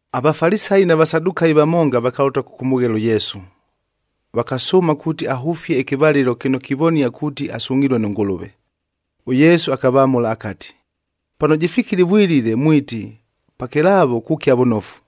AVafalisayi na Vasadukayi vamonga vakalʉta kʉkʉmʉghela ʉYesu, vakasʉʉma kuuti ahʉfie ɨkɨvalɨlo kɨno kivonia kuuti asungʼhilue nʉ Ngʉlʉve. ɄYesu akavamʉla akati, “Pano jɨfikile ɨvwilile mwiti, ‘Pakɨlaavo kukia vʉnofu,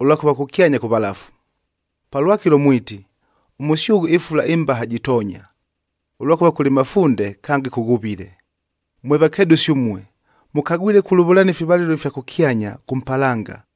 ʉlwakʉva kʉkyanya kʉvalafu.’ Palwakɨlo mwiti, ‘Ʉmʉsyʉghʉ ɨfula ɨmbaha jitoonya, ʉlwakʉva kʉlɨ mafunde kange kʉghuvile.’ Mwe vakedʉsi ʉmue, mʉkagwile kulʉvʉlania ifivalɨlo ifya kʉkyanya kʉ mpalanga,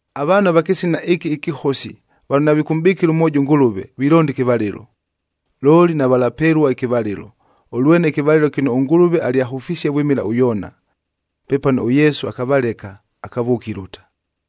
Avaanhu va kɨsina ɨkɨ ɨkɨhosi, vano navikʉmʼbɨkɨla mwojo ʉNgʉlʉve,b vilonda ɨkɨvalɨlo. Looli navalapelua ɨkɨvalɨlo, ʉlwene ɨkɨvalɨlo kɨno ʉNgʉlʉve alyahʉfisie vwɨmɨla ʉYoona.” Pepano ʉYesu akavaleka, akavʉʉka ilʉta.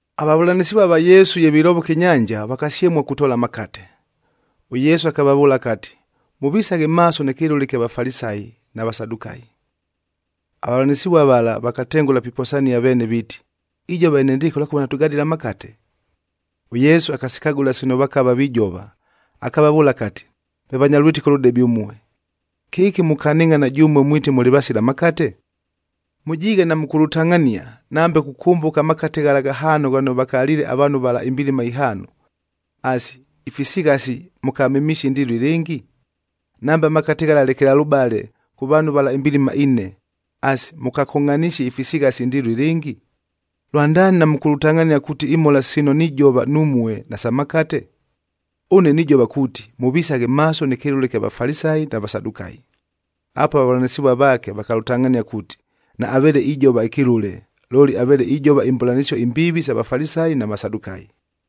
Avavʉlanɨsɨvua va Yesu ye vilovoka ɨnyanja, vakasyemua kutoola amakate. ɄYesu akavavʉʉla akati, “Mʉvisaghe maaso nɨ kɨlʉle ɨkya Vafalisayi na Vasadukayi.” Avavʉlanɨsɨvua vala vakatengʉla piposania veene viiti, “Ijova enendɨɨkɨ ʉlwakʉva natʉgadile amakate!” ɄYesu akasikagʉla sino vakava vijova, akavavʉʉla akati, “Mwe vanya lwɨtɨko lʉdebe ʉmue! Kɨki mukanɨngʼhana jʉmue mwiti mʉlɨ vasila makate? Mʉjiighe namʉkʉlʉtangʼhania, nambe kukʉmbʉka amakate ghala ghahaano ghano vakaliile avaanhu vala imbilima ihaano. Asi, ifisighasi mʉkamemisie indɨɨlo ilɨngi? Nambe amakate ghala lekelalʉbale kʉ vaanhu vala imbilima ine, asi, mʉkakongʼhanisie ifisighasi indɨɨlo ilɨngi? Lwandaani namʉkʉlʉtangʼhania kuuti imhola sino nijova numue nasa makate? Ʉne nijova kuuti, mʉvisaghe maaso nɨ kɨlʉle ɨkya Vafalisayi na Vasadukayi.” Apuo avavʉlanɨsɨvua vaake vakalʉtangʼhania kuuti naaveele ijova ɨkɨlʉle, looli aveele ijova imbʉlanɨsio imbiivi isa Vafalisayi na Vasadukayi.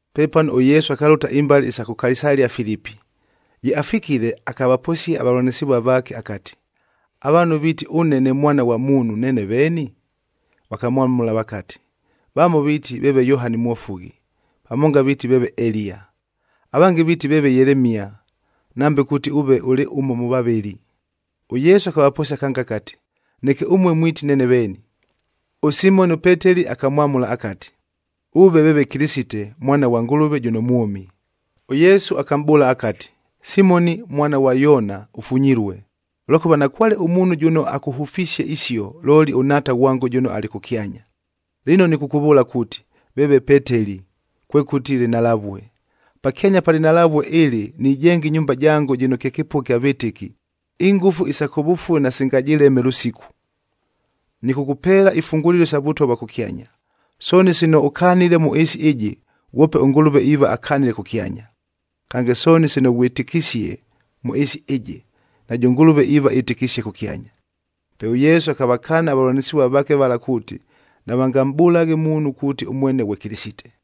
Pepano ʉYesu akalʉta imbale isa kʉ Kaisalia-Filipi. Ye afikile, akavaposia avavʉlanɨsɨvua vaake akati, “Avaanhu viiti ʉne ne Mwana ghwa Muunhu, neene veeni?” Vakamwamʉla vakati, “Vamo viiti veeve Yohani Mwofughi, vamonga viiti veeve Eliya, avange viiti veeve Yelemia, nambe kuuti ʉve ʉlɨ ʉmo mʉ vavɨli.” ɄYesu akavaposia kange akati, “Neke ʉmue mwiti neene veeni?” ɄSimoni ʉPeteli akamwamʉla akati, “Ʉve veeve Kɨlɨsite, Mwana ghwa Ngʉlʉve jʉno mwʉmi.” ɄYesu akamʼbʉʉla akati, “Simoni mwana ghwa Yoona ʉfunyilue, ʉlwakʉva nakwale ʉmuunhu jʉno akʉhʉfisie isio, looli ʉNhaata ghwango jʉno alɨ kʉkyanya. Lɨno nɨkʉkʉvʉʉla kuuti, veeve Peteli, kwekʉti lɨnhalavue. Pakyanya pa lɨnhalavue ɨlɨ nijenga ɨnyumba jango jɨno kye kɨpʉgha kya vɨtɨki, ingʉfu isa kʉvʉfue nasingajɨleme lʉsiku. Nɨkʉkʉpeela ifungulilo isa Vʉtwa vwa kʉkyanya, sooni sino ʉkanile mʉ ɨɨsi ɨjɨ, ghwope ʉNgʉlʉve iiva akanile kʉkyanya. Kange, sooni sino ghwɨtɨkisie mʉ ɨɨsi ɨjɨ, najʉ Ngʉlʉve iiva ɨtɨkisie kʉkyanya.” Pe ʉYesu akavakaana avavʉlanɨsɨvua vaake vala kuuti, navangamʼbʉlaghe muunhu kuuti ʉmwene ghwe Kɨlɨsite.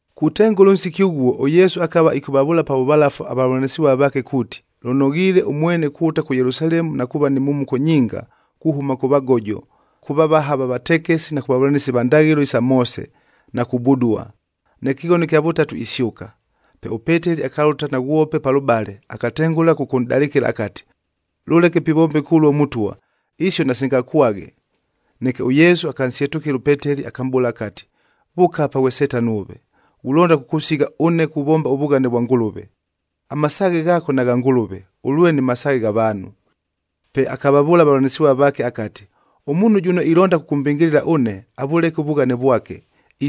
Kutengʉla ʉnsiki ʉghuo, ʉYesu akava ɨkʉvavʉʉla pa vʉvalafu avavʉlanɨsɨvua vaake kuuti, lʉnoghiile ʉmwene kulʉta kʉ Yelusalemu na kuuva ni mhumuko nyinga kuhʉma kʉ vagojo, kʉ vavaha va vatekesi na kʉ vavʉlanɨsi va ndaghɨlo isa Moose,c na kubudua. Neke ɨkɨghono ɨkya vʉtatu isyʉka. Pe ʉPeteli akalʉta naghwope palʉbale, akatengʉla kʉkʉnʼdalɨkɨla akati, “Lʉleke pivombeka ʉluo Mʉtwa! Isio nasingakwaghe!” Neke ʉYesu akansyetʉkɨla ʉPeteli, akamʼbʉʉla akati, “Vʉʉka apa ghwe Setano ʉve! Ghulonda kʉkʉsigha ʉne kuvomba ʉvughane vwa Ngʉlʉve! Amasaaghe ghaako nagha Ngʉlʉve, ʉlwene masaaghe gha vaanhu.” Pe akavavʉʉla avavʉlanɨsɨvua vaake akati, “Ʉmuunhu jʉno ilonda kʉkʉmbɨngɨlɨla ʉne, avʉleke ʉvughane vwake,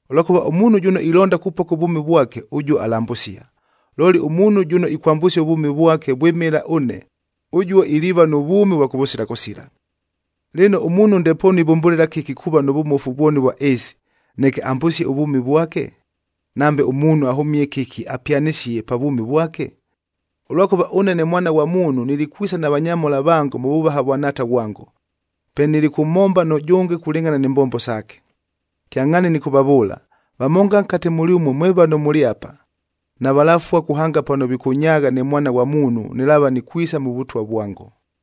Ʉlwakʉva ʉmuunhu jʉno ilonda kupoka ʉvwʉmi vwake, ʉjuo alambʉsia, looli ʉmuunhu jʉno ikwambʉsia ʉvwʉmi vwake vwɨmɨla ʉne, ʉjuo iliiva nʉ vwʉmi ʉvwa kʉvʉsila kʉsila. Lɨno, ʉmuunhu ndepoonu ivʉmbʉlɨla kɨki kuuva nʉ vʉmofu vwoni ʉvwa ɨɨsi, neke ambʉsie ʉvwʉmi vwake? Nambe ʉmuunhu ahʉmie kɨki apyanɨsie pa vwʉmi vwake? Ʉlwakʉva ʉne ne Mwana ghwa Muunhu nilikwisa na vanyamhola vango mʉ vʉvaha vwa Nhaata ghwango. Pe nilikʉmhomba nʉjʉnge kulɨngʼhana ni mbombo saake. Kyangʼhaani nɨkʉvavʉʉla, vamonga nkate mʉlyʉmue mwe vano mʉlɨ apa, navalafua kuhanga pano vikʉnyaagha ne Mwana ghwa Muunhu nɨlaava nikwisa mʉ Vʉtwa vwango.”